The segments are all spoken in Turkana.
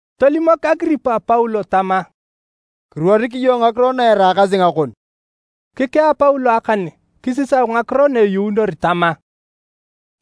Tolimok Agiripa Paulo tama, “Kiruorik iyong ngakiro na eraakasi ngakon.” Kikea Paulo akan kisisau ngakiro na eyuunor tama,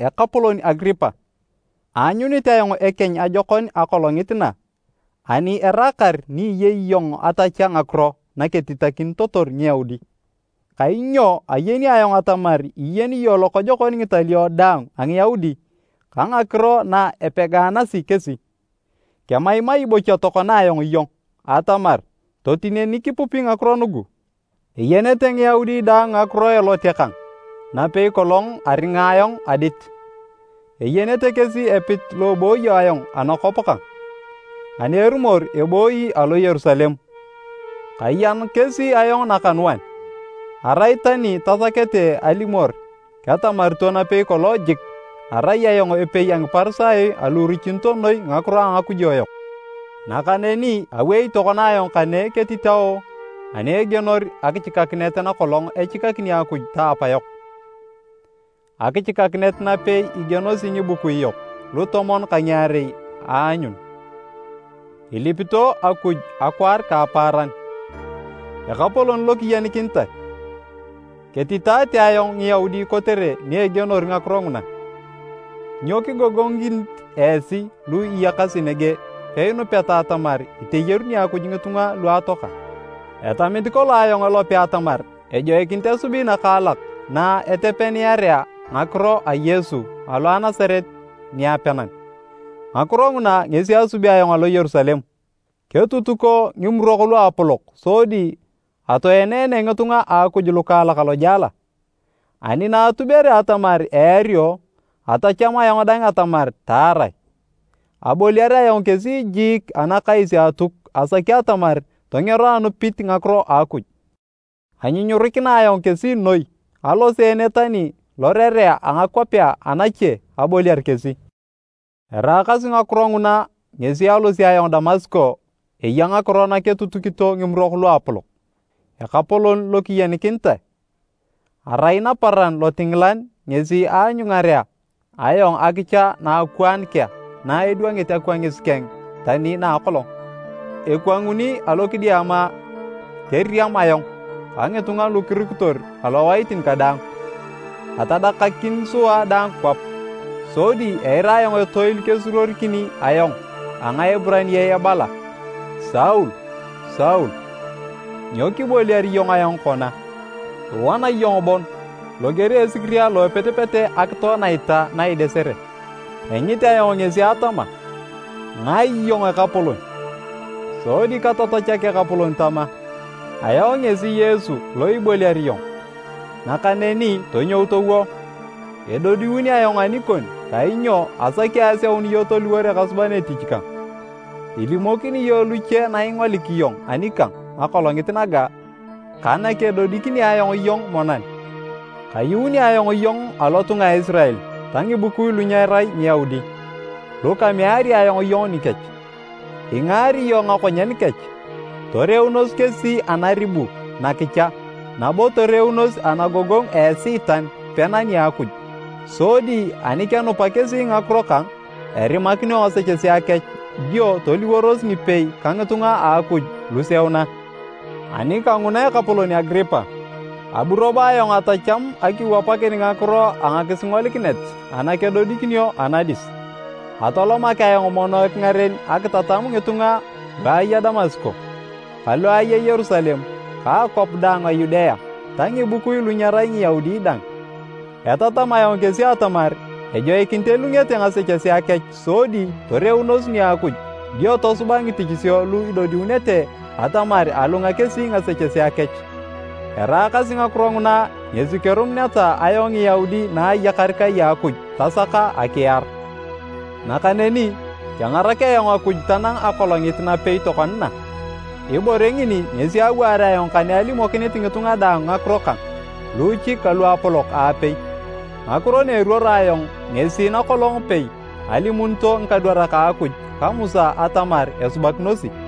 “Ekapolon Agiripa! Aanyunit ayong ekeny ajokon akolongit na ani eraakar ni iyei iyong atachea ngakiro na ketitakinitotor Ngiyaudi, kainyo ayeni ayong atamar iyeni iyong lokojokon ngitalio daang a Ngiyaudi ka ngakiro na epegaanasi kesi. Kemaimai bocha tokona ayong iyong atamar totinenik ipupi ngakiro nugu. “Eyenete Ngiyaudi daang ngakiro a elote kang napei kolong aringa ayong adit. Eyenete kesi epit lo ebooyo ayong anakwap kang, ani erumor ebooyi alo Yerusalem. Kayan kesi ayong nakanuan, arai tani tasakete alimor, ketamarito napei kolong jik, arai ayong epei a Ngiparisayo alu irichito noi ngakiro a ngakujo yok. Nakaneni awei tokona ayong kane ketitao ani egienor akichikakinet nakolong echikakini Akuj ta apayok, akichikakinet napei igienosi ngibukui yok lutomon ka ngiarei aanyun, ilipito Akuj akwaar ka apaaran. Ekapolon lokiyenikinitae! Ketitaate ayong Ngiyaudi kotere ni egienor ngakiro nguna! Nyo kigogongikinit esi lu iyakasi nege peinupeta atamar iteyaruni Akuj ngitunga lu atoaka? “Etamit kolong ayong elope atamar ejoikinit asubi nakaalak na etepeniarea ngakiro a Yesu alo a Nasaret niapenan. Ngakiro nguna ngesi asubi ayong alo Yerusalem. Ketutuko Ngimurok Luapolok sodi atoenene ngitunga a Akuj lukaalak alojela. Ani na atubere atamar eario, atacham ayong dang atamar taarae. Aboliar ayong kesi jiik anakais a Atuk asaki atamar tongero anupit ngakiro a Akuj. Anyunyurikina ayong kesi noi aloseene tani lorerea a ngakwapea anache aboliar kesi. “Eraakasi ngakiro nguna ngesi alosio ayong Damasko eya ngakiro na ketutukito Ngimurok Luapolok. Ekapolon lokiyenikinitae, arai naparan lotingilan ngesi aanyungarea ayong akicha naakwaan kea na idwangit akwangis keng tani na a akolong, ekwanguni alo kidiama keriam ayong ka ngitunga lu kirukitor alowaitin kadaang. Atadakakin sua daang kwap, sodi eira ayong etoil kesuruorikini ayong a Ngaeburaniae ebala, ‘Saul, Saul, nyo kiboliar iyong ayong kona? Iwana iyong bon loger a esikiria alo epetepete akitoe naita na idesere.’ Engit ayong ngesi atama, ‘Ngae iyong Ekapolon?’ Sodi katatachak Ekapolon tama, ‘Ayong ngesi Yesu lo iboliar iyong. Nakaneni tonyou towo. Edodiun ayong anikon kainyo asaki aseun iyong toliwor ekasuban etich kang. Ilimokini iyong luche na ingolik iyong anikang akolongit naga ka nakedodikini ayong iyong monan. Kayuuni ayong iyong alotunga a Isirael ta ngibukui lu nyerai Ngiyaudi, lu kameari ayong iyong nikech. Ingaari iyong ngakonyen kech, toreunos kesi anaribu nakicha nabo toreunos anagogongu a Esiitan pena nia Akuj. Sodi ani kenupa kesi ngakiro kang, erimakinio ngasechesea kech dio toliworos ngipei ka ngitunga a Akuj luseuna.’ “Ani kanguna Ekapolon Agiripa, abu robo ayong atacham akiwapakin ngakiro a ngakisingolikinet ana kedodikinio anadis. Atolomak ayong mono ekingaren akitatam ngitunga lu aya Damasko, ka lu aya Yerusalem ka akwap daang a Yudea ta ngibukui lu nyerai Ngiyaudi dang. Etatam ayong kesi atamar ejoikinit elungete ngasechesea kech sodi toreunos nia Akuj dio tosuba ngitichisio lu idodiunete atamar alunga kesi ngasechesea kech. Eraakasi ngakiro nguna ngesi kerumuneta ayong Ngiyaudi naayakar kai a Akuj, tasaka akiar. Nakaneni kengarak ayong Akuj tanang akolongit napei tokona na. Ibore ngini ngesi awaar ayong kane alimokinit ngitunga daang ngakiro kang, luuchik ka luapolok aapei. Ngakiro na eruoro ayong ngesi na kolong pei alimunito ngikadwarak a Akuj ka Musa atamar esubakinosi,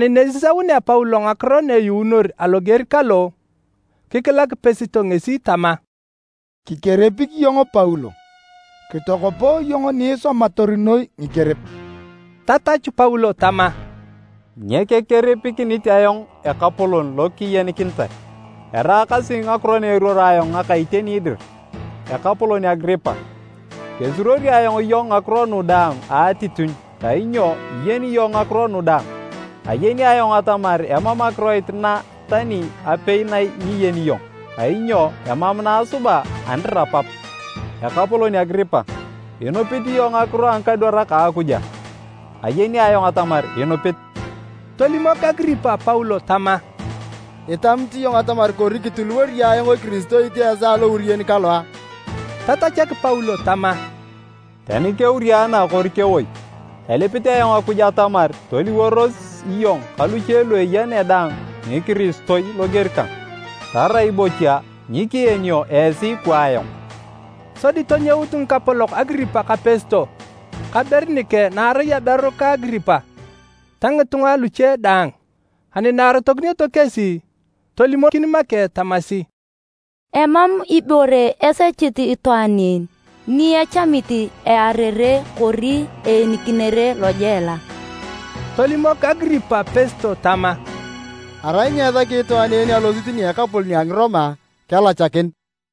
Ani na esisaunea Paulo ngakiro na eyuunor aloger kalo, kikilak Pesto ngesi tama, “Kikerepik iyong Paulo! Kitokopo iyong ni isomator noi ngikerep!” Tatachu Paulo tama, “Nyekekerepikinit ayong ekapolon lokiyenikinitae! Eraakasi ngakiro na eruoro ayong ngaka iteni dir. Ekapolon Agiripa, kesuruori ayong iyong ngakiro nu daang a atitinyu kainyo iyeni iyong ngakiro nu daang. Ayeni ayong atamar emam akiroit na tani apei na nyiyeni iyong kainyo emam na asuba anirapap! Ekapolon Agiripa, inupit iyong ngakiro a ngikadwarak a Akuj a? Ayeni ayong atamar inupit!” Tolimok Agiripa Paulo tama, “Itamit iyong atamar kori kitiliwori iyong ayong ekiristoit a esaa alouriyen kalo a?” Tatachak Paulo tama, “Tani keuriana kori kewoi, elipit ayong Akuj atamar toliworos iyong ka luche lu eya ne daang Ngikiristoi loger kang, tarai bocha nyikeenio esi kwa ayong!” Sodi tonyout ngikapolok Agiripa ka Pesto ka Berinike naarai aberu ka Agiripa ta ngitunga luche daang. Ani na arotokinioto kesi, tolimokin make tamasi, “Emam ibore esechit itwaan en ni echamit earere kori eenikinere lojela.” Tolimok Agiripa Pesto tama, “Arai nyeesaki itwaan en alosit nia ekapolon a Ngiroma, kelachakin.”